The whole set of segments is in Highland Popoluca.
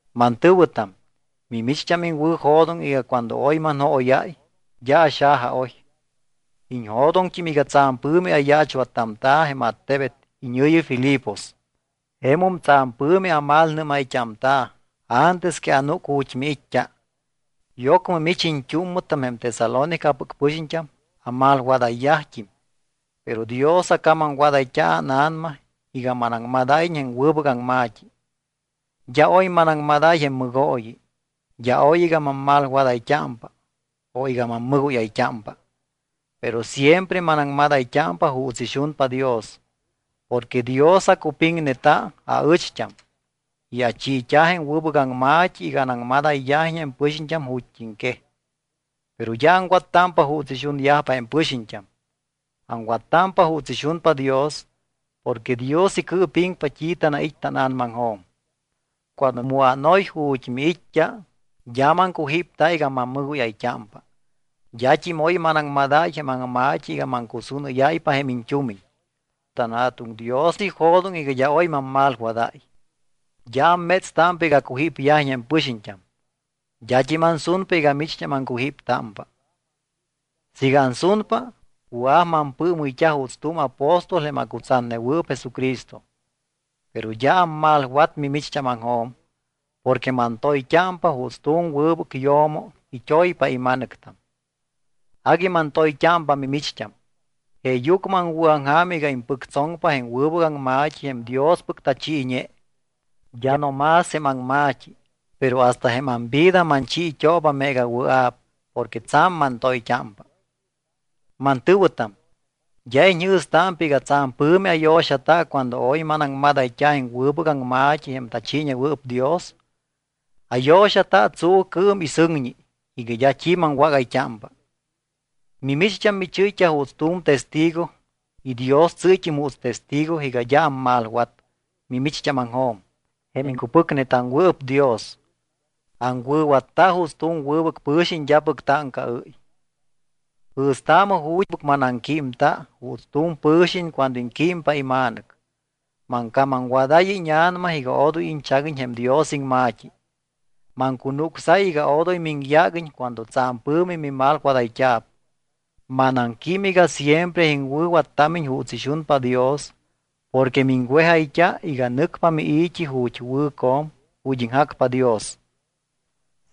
Mantɨ̱wɨtam, mimicht́am iŋwɨ̱jo̱doŋ iga cuando oy manjóyáy, d́a axajaoy. Iñjo̱doŋt́im iga tsa̱m pɨ̱mi ayaachwattamta̱ jém attebet iñɨ̱yi Filipos. Jemum tsa̱m pɨ̱mi amalnɨ́mayt́amta̱ antes que anúc ju̱t́ miit́t́a. Y ocmɨ mich iñt́úmmɨtam jém Tesalónicapɨc pɨxiñt́am amalwadayyajt́im, pero Dios acamamwadayt́a ána̱nama iga manaŋmadáyiñ jém wɨbɨc aŋma̱t́i. D́a oy manaŋmadáy jém mɨgooyi. D́a aoy iga mammalwadayt́ámpa o iga mammɨgóyayt́ámpa. Pero siempre manaŋmadayt́ámpa juuts ixunpa Dios. Porque Dios acupiŋneta aɨcht́am y achiit́a jém wɨbɨc aŋma̱t́i iga anaŋmadayyajiñ jém pɨxiñt́am ju̱t́iŋquej. Pero d́a aŋwattámpa juuts ixunyajpa jém pɨxiñt́am. Aŋwattámpa juuts ixunpa Dios porque Dios icɨɨpiŋpa t́i tanait́ tána̱namaŋjo̱m. Cuando mu ánoy ju̱t́ miit́t́a, d́a maŋcujípta iga mammɨgóyayt́ámpa. D́at́im oy manaŋmadáy jém aŋma̱t́i iga maŋcusúnɨ́yáypa jém iñt́umiñ. TanJa̱tuŋ Dios ijo̱doŋ iga d́a oy mammalwadáy. D́a ammétstámpa iga acujípyajiñ jém pɨxiñt́am. D́at́im ansunpa iga micht́am aŋcujíptámpa. Siiga ansunpa, wɨa̱p mampɨɨmɨyt́a juuts tu̱m apóstol jém acutsatnewɨɨp Jesucristo. Pero d́a ammalwat mimicht́ámaŋjo̱m, porque mantoyt́ámpa juuts tu̱m wɨbɨc yo̱mo it́oypa ima̱nɨctam. Agui mantoyt́ámpa mimicht́am, jeeyucmɨ aŋwɨ̱aŋja̱m iga impɨctsoŋpa jém wɨbɨc aŋma̱t́i jém Diospɨc tachiiñe. D́a no más jém aŋma̱t́i, pero hasta jém amvida manchiit́ooba meega wɨa̱p porque tsa̱m mantoyt́ámpa. Mantɨ̱wɨtam, ¿d́a iñjɨ̱stámpa iga tsa̱m pɨ̱mi ayo̱xata cuando oy manaŋmadayt́a jém wɨbɨc aŋma̱t́i jém tachiiñewɨɨp Dios? Ayo̱xata tsuucɨɨm y sɨŋñi iga d́a t́i maŋwágayt́ámpa. Mimicht́am michɨ́yt́a juuts tu̱m testigo y Dios tsɨ́yt́im juuts testigo iga d́a ammalwat mimicht́ámaŋjo̱m jém iŋcupɨcnetaŋwɨɨp Dios. Aŋwɨ̱watta juuts tu̱m wɨbɨc pɨ̱xiñ d́apɨc táŋcaɨ́y. Jɨ̱staamɨ ju̱t́pɨc manaŋquímta juuts tu̱m pɨ̱xiñ cuando iŋquímpa ima̱nɨc. Maŋcamamwadáy íña̱nama iga odoy iñchaguiñ jém Dios iŋma̱t́i. Maŋcunucsáy iga odoy miŋyáguiñ cuando tsa̱m pɨ̱mi mimalwadayt́a̱p. Manaŋquím iga siempre iŋwɨ̱wattámiñ juuts ixunpa Dios porque miŋwejayt́a iga nɨcpa mii̱t́i ju̱t́ wɨ̱co̱m, ju̱t́ iŋjacpa Dios.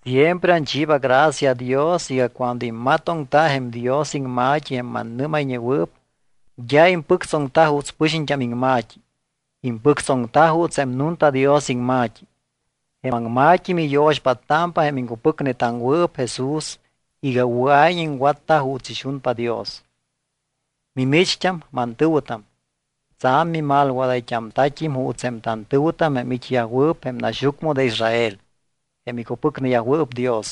Siempre anchiiba gracia Dios iga cuando immatoŋta jém Dios iŋma̱t́i jém manamíñayñewɨɨp, d́a impɨctsoŋta juuts pɨxiñt́am iŋma̱t́i, impɨctsoŋta juuts jém nunta Dios iŋma̱t́i. Jém aŋma̱t́i miyo̱xpáttámpa jém iŋcupɨcnetaŋwɨɨp Jesús iga wɨa̱iñ iŋwatta juuts ixunpa Dios. Mimicht́am, mantɨ̱wɨtam, tsa̱m mimalwadayt́amta̱t́im juuts jém tantɨ̱wɨtam jém it́yajwɨɨp jém naxyucmɨ de Israel, jém icupɨcneyajwɨɨp Dios.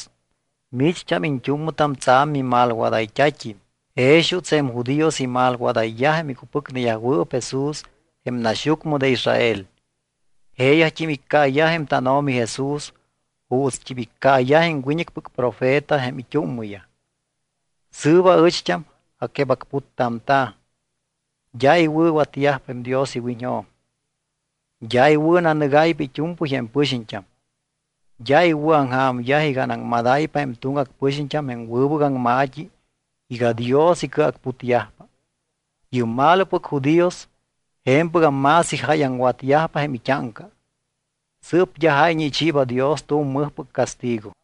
Micht́am iñt́úmmɨtam tsa̱m mimalwadayt́at́im jex juuts jém judíos imalwadayyaj jém icupɨcneyajwɨɨp Jesús jém naxyucmɨ de Israel. Jeeyajt́im iccaayaj jém tánO̱mi Jesús juutst́im iccaayaj jém wiñɨcpɨc profeta jém it́úmmɨyaj. Sɨɨp aɨcht́am aquebacputtamta̱. D́a iwɨ̱watyajpa jém Dios iwiñjo̱m. D́a iwɨ̱nanɨgáypa it́u̱mpɨy jém pɨxiñt́am. D́a iwɨ̱aŋja̱myaj iga anaŋmadáypa jém tuŋgac pɨxiñt́am jém wɨbɨc aŋma̱t́i iga Dios icɨacputyajpa. Yɨ́p malopɨc judíos je̱mpɨgam más ijáyaŋwatyajpa jém it́áŋca. Sɨɨp d́a jáyñe ichiiba Dios tu̱m mɨjpɨc castigo.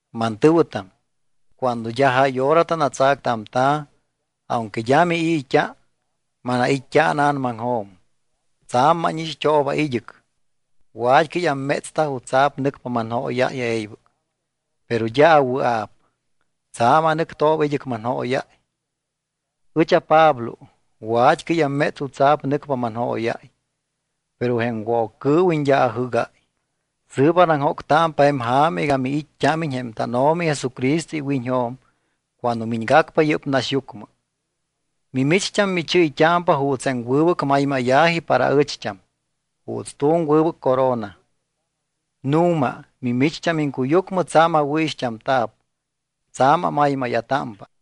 Mantɨ̱wɨtam, cuando d́a jáy hora tanatsactamta̱, aunque d́a mii̱t́a, manait́t́a ána̱namaŋjo̱m. Tsa̱m mánixt́ooba id́ɨc, wa̱t́cɨy ammétsta jutsa̱p nɨcpa manjóyáy e̱ybɨc, pero d́a awɨa̱p. Tsa̱m anɨctamtooba id́ɨc manjóyáy. Ɨch aPablo wat́cɨy amméts jutsa̱p nɨcpa manjóyáy, pero jém Woccɨɨwiñ d́a ajɨ́gáy. Sɨɨp anaŋjóctámpa jém ja̱ma iga miit́t́ámiñ jém tánO̱mi Jesucristo iwiñjo̱m cuando miñgacpa yɨ́p naxyucmɨ. Mimicht́am michɨ́yt́ámpa juuts jém wɨbɨc maymáya̱ji para aɨcht́am, juuts tu̱m wɨbɨc corona. Nu̱ma mimicht́am iŋcuyucmɨ tsa̱m awɨ̱ixt́amta̱p, tsa̱m amaymáya̱támpa.